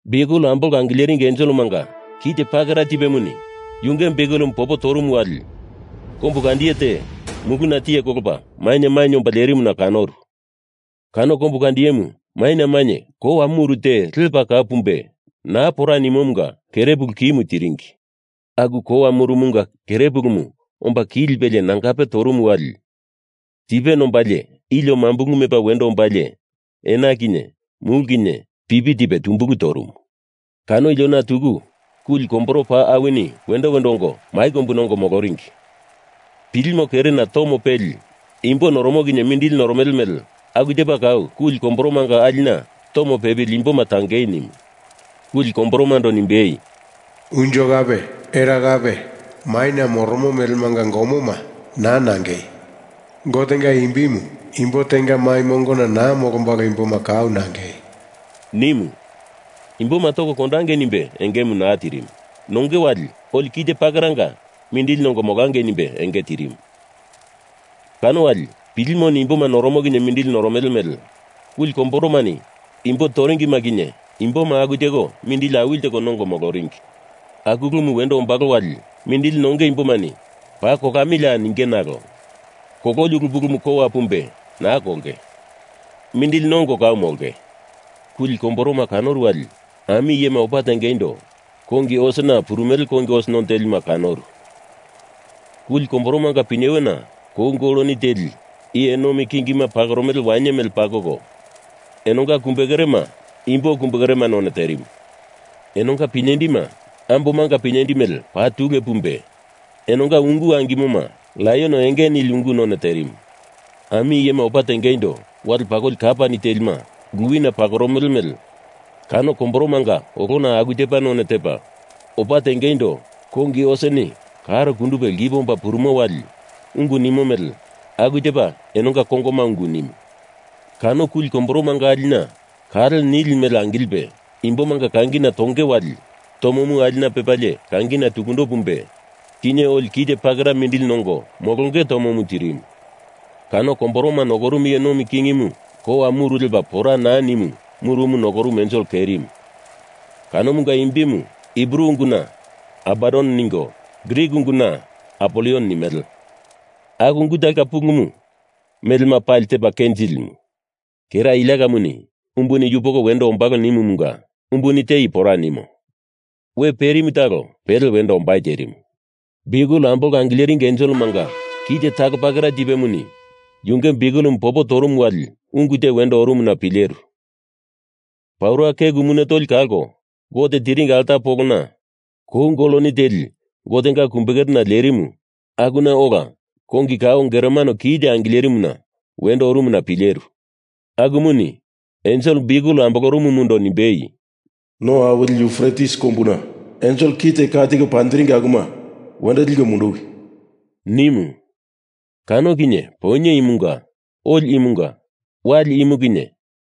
Biukel ambolko angileringi enselemanga kite pakera tipemuni yunge biukelemu popo torumu wali kombu kandiye te muluna tiye kolopa maina mainye omba lerimuna kanoru. Kano kombu kandiyemu maina mainye kowa muru te paa lepa kau pumbe naa pora nimomunga kerepulu kimu tiringi. Aku kowa murumunga kere pulumu omba ki lipelie nangape torumu wali tipe nombalie ilio mambulu mepa wendo ombalie ena kinye mulu kinye pipi tipe tumbulu torumu. Kano iliona tuku kuli komboro paa awini wendo wendo ongo mai kombuna ongo moloringi. Pilimo kerena tomo pepili imbo noromo kinye mindili noromele mele aku tepa aku kuli komboromanga alina tomo pepili imboma tangei nimu. Kuli komboromando nimbei, “Unjo kape era kape maina moromo melemanga gomoma naa nangei! Gotenga imbimu imbo tenga mai mongona naa molombalo imboma kau nangei,” nimu. Imboma toko kondangei nimbe engemu naa tirimu. Nonge wali oli kite pakera mindili nongo molangei nimbe enge tirimu. Kano wali pilimoni imbo toromo kinye mindili noromele mele kuli komboromani imbo toringi kinye imboma aku teko mindili awili teko nongo moloringi. Aku ulumu wendo ombalo wali mindili nonge imbomani paa kolamilia ninge nalo kololi ulu pulumu kowa pumbe naa kolonge. Mindili nongo kau molonge. Kuli komboroma kanoru wali ami iyema opa tengeindo kongi osena purumele kongi os none telima kanoru. Kuli komboromanga pinyewena kou goloni teli iye nomi kingima pakoromele wainye mele pakoko, enonga kumbe kerema imbo kumbe kere none terimu. Enonga pinyendima ambomanga pinyendi mele paa tule pumbe, enonga ungu angimoma laion enge nili ungu none terimu. Ami iyema opa tengeindo wale pakoli kapani telima luwina pakoromele mele kano komboromanga olona aku tepa none tepa, opa tengeindo kongi oseni karo kundupe lkipe omba purumo wali ungu nimo mele aku tepa enonga kongoma ungu nimu. Kano kuli komboromanga alina kale nili mele angilipe imbomanga kangina tonge wali tomomu alina pepalie kangina tukundo pumbe kinye oli kite pakera mindili nongo molonge tomomu tirimu. Kuli komboroma nokorumu iye nomi kingimu kowa muru lepa pora naa nimo murumu nokoromo ensel kerimu, kanomunga imbimu Hibru unguna Abadon ningo, Grik unguna Apolion nimele. Aku ungu talonga pulumu Melema Pali Tepa Kenjilimu. Kera iliakamuni umbuni yupoko wendo ombalo nimumunga umbuni te i pora nimo. We perimu talo pele wendo ombai terimu. Biukel ambolko angileringi enselemanga kite talo pakera tipemuni yunge biukelemu popo torumu wali ungu te wendo orumuna pileru. Paura keku mune tolima kalko Gote tiringi alta polo kou goloni teli Gotenga kumbe kerena lerimu akuna ola kongi kao geromano kite angilerimuna wendo orumuna pileru. Akumuni ensel biukel ambolorumumundo nimbei, “No awili Yufretis kombuna ensel kite ka tiko panjiringi akuma wendo liko munduwi!” nimu. Kano kinye Poinye imunga, oli imunga, wali imu kinye,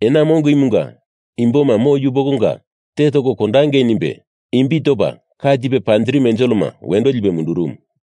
ena mongo imunga imboma mo yupokonga te toko kondangei nimbe imbi topa ka tipe panjirimu enselema wendo lipe mundurumu.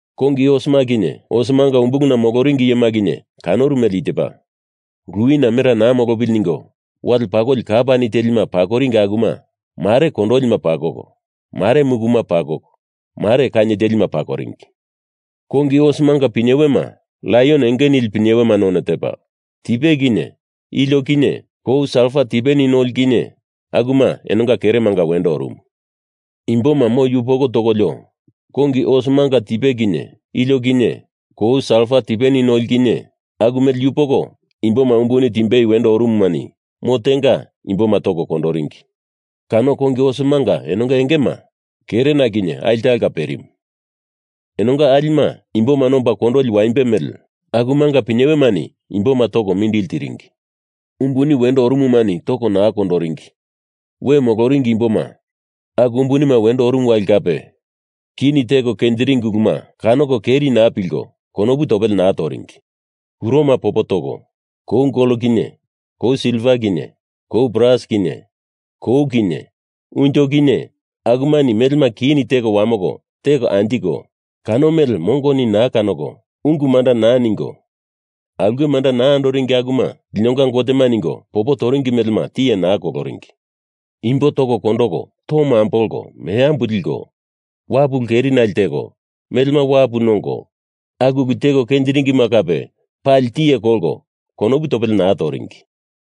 Kongi osema kinye osemanga umbuluna moloringi iyema kinye kanoru mele i tepa: Luwina mera naa molopili ningo wale pakoli kapani telima pakoringi akuma mare kondolima pakoko, mare mukuma pakoko, mare kainye telima pakoringi. Kongi osemanga pinyewema laion enge nili pinyewema none tepa, tipe kinye ilio kinye kou salfa tipeni noli kinye akuma enonga keremanga wendo orumu. Imboma mo yupoko tokolio, kongi osemanga tipe kinye ilio kinye kou salfa tipeni noli kinye aku mele yupoko imboma umbuni timbei wendo orumumani mo tenga imboma toko kondoringi. Kano kongi osemanga engema enonga kerena kinye alina talonga perimu. Enonga alima imbo nomba kondoli waimbe mele, akumanga pinyewemani imboma toko mindili tiringi. Umbuni wendo orumumani toko naa kondoringi we moloringi imboma aku umbunima wendo orumu wali kape kini teko kenjiringi uluma kanoko keri naa pilko konopu topele naa toringi. Kuroma popo toko, kou gol kinye kou silva kinye kou bras kinye kou kinye unjo kinye akumani melema kini teko wamoko teko anjiko, kano mele mongomani naa kanoko ungu manda naa ningo aulke manda naa andoringi akuma linonga gotema ningo popo toringi melema tiye naa koloringi. Imbo toko kondoko, tomo ambolko, meambu liko, wapu ulu kerinale teko, melema wapu nongo, aku ulu teko kenjiringima kape pali tiye kolko konopu topele naa toringi.